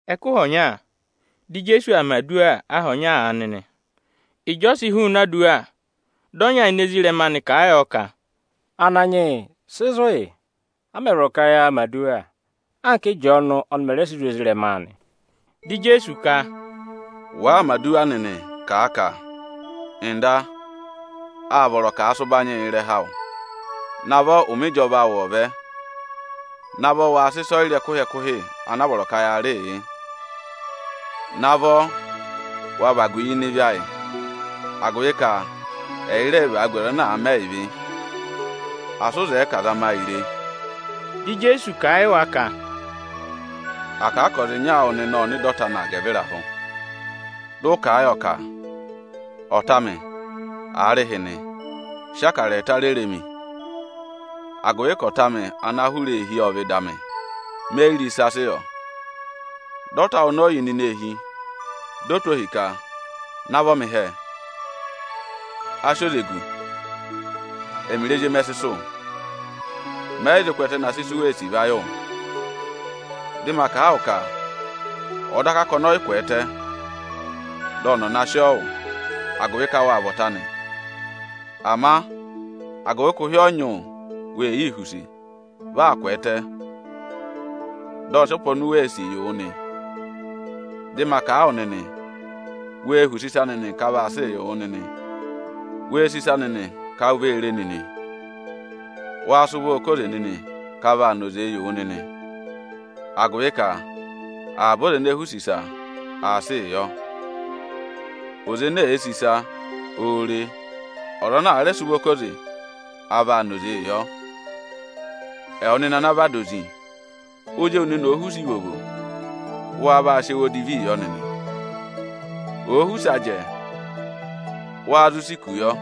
Ẹkụhị ọnya, dị Ijeesu aa mẹ̀ aduwa aha ọnya aanị nị. Ịjị ọ sị hụụnị aduwa, dị ọnya ini ezirẹma anị kà a yọ ka, “Ananyị yị, sị zụ̀ yị, a mẹ̀ vọrọ ka yaa mẹ̀ aduwa, anka Ị́jọọnụ ọnị mẹ̀ rẹ sị zụ̀ ezirẹma anị!” Dị Ijeesu ka, “Wàaa mẹ̀ aduwa nịnị, kà a ka: ‘Nda, â vọrọ ka à sị ụbanyị yị ịrẹha awụ. Navọ ụmẹ ịjọva awụ ọ̀ vẹ! Navọ wa sị ịsọyịrị ẹkụhị-ẹkụhị ana a vọrọ ka yaa rịị yị! Navọ wa vagu yi ịnị ịvị ayị; agụvị ka ẹ yị rẹẹ̄ vagu ọza ana àa rị ịvị ayị. Asị ụ zẹẹ ka à zama yị re!’” Dị Ijeesu kà a yị wa ka, “À kà a ka ọza ịnya awụ nịnị ộ nọ ịdị ọta anị agẹvịrahụ, dị ụ kà a yọ ka: ‘Ọta amị, aarịhịnị, sị akara ẹẹta rere mi; agụvị ka ọta amị ana aa hụrẹ eehi ộ vẹ ịdị amị, me yi re ịsa sị yọ.’ Dị ọta awụ ọnọọ yà ịnịnẹ eehi, di o tụ́ ohi ka: ‘Navọ mị hẹẹ; a sị oze gù, ẹmịrị ezi emi ẹ sị sụ̀. Mẹ yị zụ kwẹẹtẹ na sị isu wee sì va yị wụ.’ Dị ma kà a wụ ka ọ̀ọ daka ka ọnị ọ yị kwẹẹtẹ, dị ọnị ọ̀ na sị ọọ wụ, agụvị ka wâ vị ọta anị, ama agụvị ka ụhị ọ nyị wụ, wee yii họ̀ use, vi aa kwẹẹtẹ, dị ọ sị ọpa oni u wèe sì yị wụ nị. Dị ma kà a wụ nịnị: Wee họ̀ use ịsa nịnị ka a vaa sị yị wụ nịnị! Wee sì ịsa nịnị ka u vee re e nịnị! Waa sị ụvọọ ká oze nịnị ka a vaa na oze yị wụ nịnị! Agụvị ka avaba ọza ene èe họ̀ use ịsa, aā sịị yọ; ọza ene èe sì ịsa, oō re e; ọza ana àa rẹ sị ụvọ ká oze, a vaa na oze yọ. Ẹwụ nịnị ana vị ada ozi, ozi ewu nịnị òo họ̀ use ivovo, wáá vaa sị ẹwụ odivii yọ nịnị? Òo họ̀ use ajẹ, wáá zụ sị iku yọ?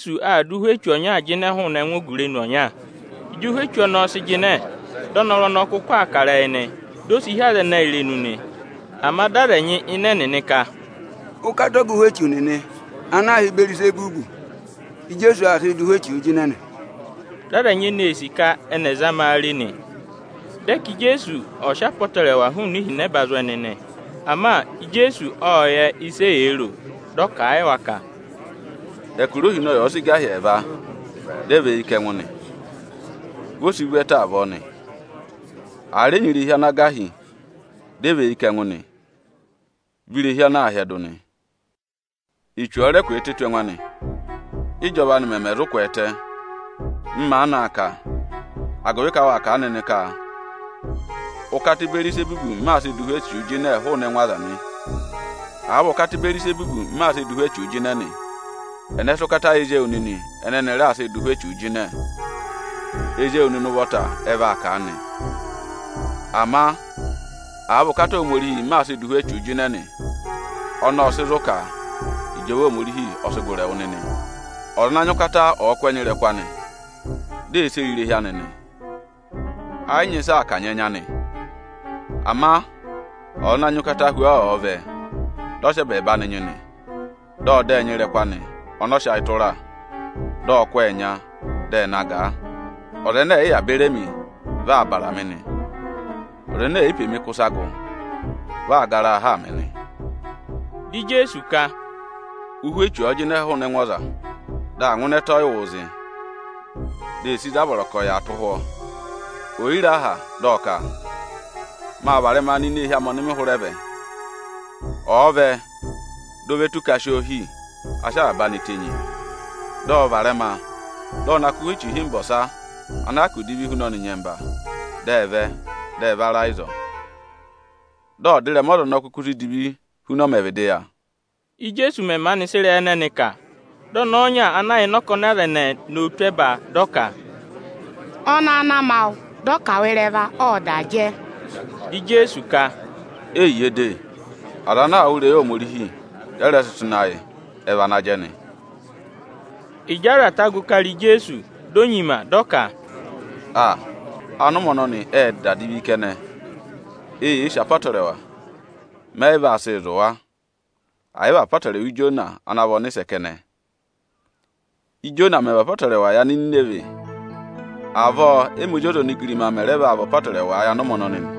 Ijeesu aa dụ ụhwẹ echu ọnyaa jịnẹ hụụnị ẹngụ ogurenu ọnya. Ịjị ụhwẹ echu ọnọọ sị jịnẹ, dị ọnọrụ ọnọọ kụkụ aa kà ịrẹyị nị. Di o si hí aza ẹnẹ irenu nị. Ama dị aza ẹnyị ịnị ẹnịnị ka, “Ụkata ọga ụhwẹ echu nịnị ana aā hị́ Ịbẹẹrịzẹbụ, Íjeesu aa sịị dụ ụhwẹ echuu jịnẹ nị.” Dị aza ẹnyị eni ee sì ka ẹnị ẹ̀ zama a re nị. Dị ẹ ka Ijeesu ọ̀ sị apọtẹrẹwa hụụnị ihinẹba zụ̀ ẹnị nị. Ama Ijeesu ộ yẹ ịsị eyee ro. Dị ọ kà a yị wa ka, “Ẹkụra ohinọyị ọ̀ọ sị gà hi ẹẹva, dị ẹ và eyi kà ẹngụ nị, vi o si vu ẹtẹ avọọ nị. Àa rẹ nyị irehi ana gà hi, dị ẹ và eyi kà ẹngụ nị, vị irehi ọnọọ aa hyẹdụ nị. Echu ọ̀ọ rẹ kwẹẹtẹ tù ẹngụ anị, ị́jọva anị mẹmẹ zụ kwẹẹtẹ? M maanị aa kà, agụvị ka waa kà a nịnị ka ụkata Ịbẹẹrịzẹbụ m maa sịị dụ ụhwẹ echuu jịnẹ hụụnị ẹngụ aza nị. Àa vị ụkata Ịbẹẹrịzẹbụ m maa sịị dụ ụhwẹ echuu jịnẹ nị, ẹnẹ sị ụkata yị ezi ewu nịnị ẹnẹ ẹnị raa sịị dụ ụhwẹ echuu jịnẹ? Ezi ewu nịnị ụvọta ẹ vaa kà a nị. Ama àa vị ụkata Ohomorihi m maa sịị dụ ụhwẹ echuu jịnẹ nị, ọnọọ ộ sị zụ̀ ka ịjọva Ohomorihi ọ sị gụrị ẹwụ nịnị. Ọza ana nyị ụkata ọ̀ọ kụ́ ẹnya ịrẹkụ anị, di ee sere irehi anị nị, ẹ yị nyị ịsị aa kanyị ẹnya anị. Ama ọza ana nyị ụkata hu ọọ, ọ̀ọ vẹ, dị ọ sị ẹbẹẹba anị nyị nị, dị ọ dọ ọ ẹnya ịrẹkụ anị ọnị ọ sị ayị tụra, dị ọ kụ́ ọọ ẹnya, dị ẹ na gà a. Ọza ẹnẹ ẹ̀ yị yà beri emi, vị aa bàrà mị nị. Ọza ene è yi pe mi kụ́ ịsa gụ, vị aa gara a haa mị nị.” Dị Ijeesu ka, “Ụhwẹ echu ọ̀ọ jịnẹ hụụnị ẹngụ ọza, dị aa ngụ ịnị ẹtẹ ọyịwụụ zị, di ee sì ịzị a vọrọ ka ọ̀ yà tụ́ ụhwọ́. Ò yi re aha, dị ọ ka: ‘Maa varẹma nọ ini eehi amị ọnị mị hụrẹ vẹ.’ Ịjị ọ vẹ, di o ve tù ka a si oo hì, a sị avaba anị tenyi nị. Dị ọ varẹma, dị ọ na kụ́ ụhwẹ echu ịhịmba ọsa ana hyakụ divi hu ọnị nyẹmba; dị ẹ vẹ, dị ẹ va ra ịzọọ. Dị ọdịrẹma ọza ọnọọ kuku si divi huna, ọ mẹẹ̄ vịdịị yà.” Íjeesu mẹ̀ maanị sị ịrẹyị ẹnẹnị kà, dị ọnẹẹ ọnya ana yà ịnị ọkọnị aza ẹnẹẹ, nowu tụ́ ẹba dị ọ ka, “Ọnẹẹ ana ma wụ, dị ọ kà wụ ịrẹva, ộ da jẹ.” Dị Ijeesu ka, “Eyiye de, aza ana aa wụ́ ịrẹyị Ohomorihi, dị ẹ rẹ sị tụ́ ịnị ayị, ẹ vị ana jẹ nị.” Ịjị aza ta gụ kara Ijeesu, di o nyima dị ọ ka, “Aa! Anụmẹ ọnọnị ệ da divi kẹnẹ. Eyee sì apọtẹrẹwa, mẹ yị vaa sịị zụ̀ wa, ẹ̀ yị vị apọtẹrẹwa Ijona ana vị ọnịsẹ kẹnẹ. Íjona mẹ̀ vị apọtẹrẹwa yị Anininivẹ, avọọ ẹ́mị Ozi ọza onigirima mẹ̀ rẹ vaa vị apọtẹrẹwa yị anụmẹ ọnọnị nị.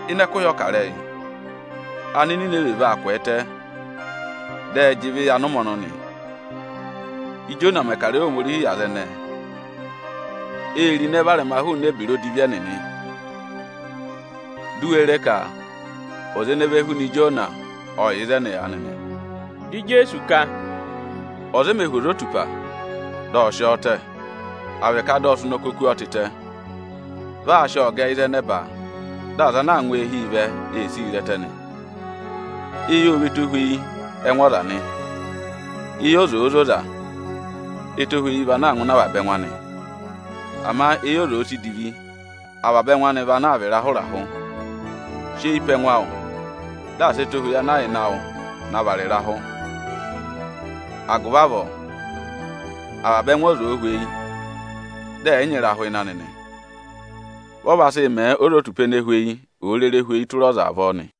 Ịnị ẹkụhị ọkarẹyị, Anininivẹ nịnị vaa kwẹẹtẹ, dị ẹ jị ịvị yị anụmẹ ọnọnị. Íjona mẹ̀ kà ịrẹyị Ohomorihi yị aza ẹnẹẹ, ê ro ịnẹ varẹma hụụnị ebira odivi ẹnịnị. Di u we re ka ọza ene ve huna Ijona, ọ yà ịzẹnị aanị nị.” Dị Ijeesu ka, “Ọza o mē hú ozotupa, dị ọ sị ọọ tẹ, à vị ka dị ọ sị ụnọkọ kú ọọ tịtẹ. Vị aa sị ọọ gẹ ịzị ẹ nẹba, dị aza ana aa ngụ eehi vẹ ee sii re ẹtẹ nị. Eyi ọ vị ẹtohweyi ẹngụ ọza nị. Eyi ọza òo zoza, ẹtohweyi vaa ngụ ịnị avaba ẹngụ anị. Ama eyi ọza òo si divi, avaba ẹngụ anị vị ana vaa vị ịrahụ-ịrahụ. Sị eyi pe ẹngụ awụ, dị asị ẹtohweyi ọnị ụ nyị tị ịnị ẹngụ awụ na vara ịrahụ! Agụvị avọọ avaba ẹngụ ọza òo hweyi, dị ẹ̀ yị nyị ịrahụ ịnị anị nị, vị ọ vaa sị mẹẹ ozotupa anaa zẹtẹ òo rere và ọpa tụra ọza avọọ nị.”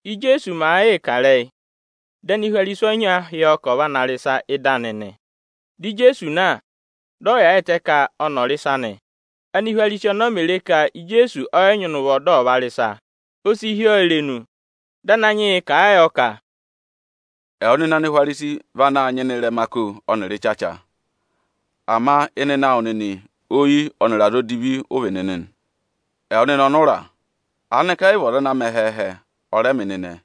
Íjeesu màa yịị kà ịrẹyị, dị Anihwarisi ọnya hị́ ọọ ka ọ̀ va na rị ịsa ị́dị anị nị. Dị Ijeesu na, dị ọ yaayịtẹ ka ọnị ọ̀ rị ịsa nị. Ánihwarisi ọnọọ mè re ka Ijeesu ọ yị nyịna ụvọ dị ọ̀ va rị ịsa, o si hí oo irenu. Dị Ananyị yị kà a yọ ka, “Ẹwụ nịnị Anihwarisi vị anaā nyịna ịrẹma ako ọnịrị ịchacha, ama ayị awụ nịnị vị ohihi yị ọhọha ọnịrị ayịchama. Ẹwụ nịnị ọnụra, aanịka ẹ yị vị ọza ana mẹ ẹhẹẹhẹ, ọ rẹ mẹ ịnịnẹẹ?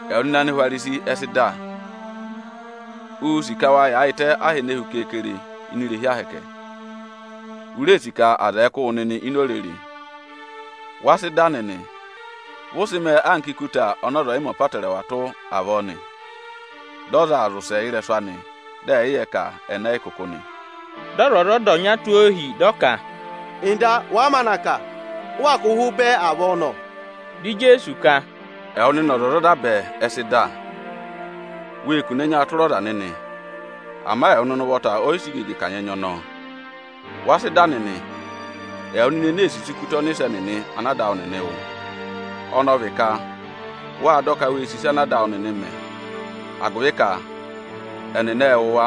Ẹwụ nịnị Anihwarisi ẹ sị dà. Uū sì ka wa yaayịtẹ aha ene hu keekere ini irehi Ohomorihi; u reē sì ka aza ẹ̀ẹ kụ́ wụ nịnị ini orere. Wa sị dà nịnị. Vị ụ sị mẹẹ anka ikuta ọnị ọza ọ̀ yị mẹ apọtẹrẹwa tụ́ avọọ nị, dị ọza aa zị ụsẹ ị́rẹsụ anị dị ẹyị yẹ ka ẹnị ẹ yị kụkụ nị.” Dị ọzwọzọda ọnya tụ́ ohi, dị ọ ka, “nda, wàa maanị aa kà, ụ waa kụ̀ yị ụhụ bẹẹ avọọ nọ!” Dị Ijeesu ka, “Ẹwụ nịnị ọzwọzọda bẹẹ, ẹ sị dà. Wee kune ẹnyaa tụra ọza nịnị, ama ẹwụ nịnị ụvọta ọ yị sị igege kanyị ẹnya ọnọọ. Wa sị dà nịnị, ẹwụ nịnị ene ee sisi ikuta ọnịsẹ nịnị ana ada awụ nịnị wụ, ọnị ọ vị ka wâ dọ ka wê sì ịsa ana ada awụ nịnị mẹ; agụvị ka ẹnị ẹ wụ̀ wa,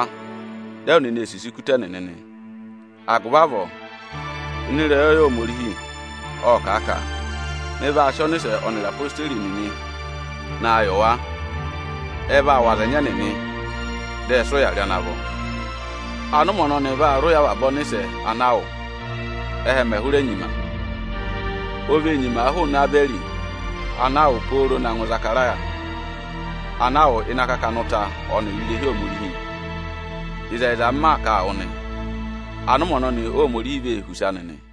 dị ẹwụ nịnị ee sisi ikuta ẹnịnị nị. Agụvị avọọ, ịnị ịrẹyọyẹ Ohomorihi, ộ kà a ka: ‘Mị vaa sị ọnịsẹ ọnịrị odeyi nịnị ị naa yị wa. Ẹ vaa wụ̀ aza ẹnyị ẹnịnị, dị ẹ sị ụya rị ana vọ!’ Anụmẹ ọnọnị vaa rị ụya avaba ọnịsẹ ana a wụ̀ hụrị ẹhẹ mẹ̀ hụrẹ nyima. Ịtọ 24.20,21O vee nyima hụụnị Ebẹrị ana a wụ̀ na ngụ Ịzakaraya ana a wụ ịnị akakana ụta ọnịrị irehi Ohomorihi. Ịzẹyịza, m maa kà a wụ nị, anụmẹ ọnọnị Óhomorihi vaa sị ụya ịrẹyị aza ẹnẹnịị rị nị.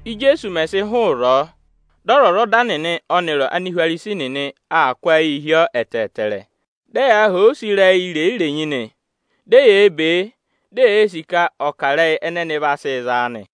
Íjeesu mẹ̀ sị hụụ ịzọọ, dị ọzwọzọda nịnị ọnịrị Anihwarisi nịnị aa kụ́ ayịị hi ọọ ẹtẹẹtẹrẹ, dị ẹyaa họ̀ ọ use ịrẹyị irenyi-irenyi nị. Di eyee be e, di eyee sì ka ọ̀ kà ịrẹyị ẹnẹ ẹnị vaa sị za a nị.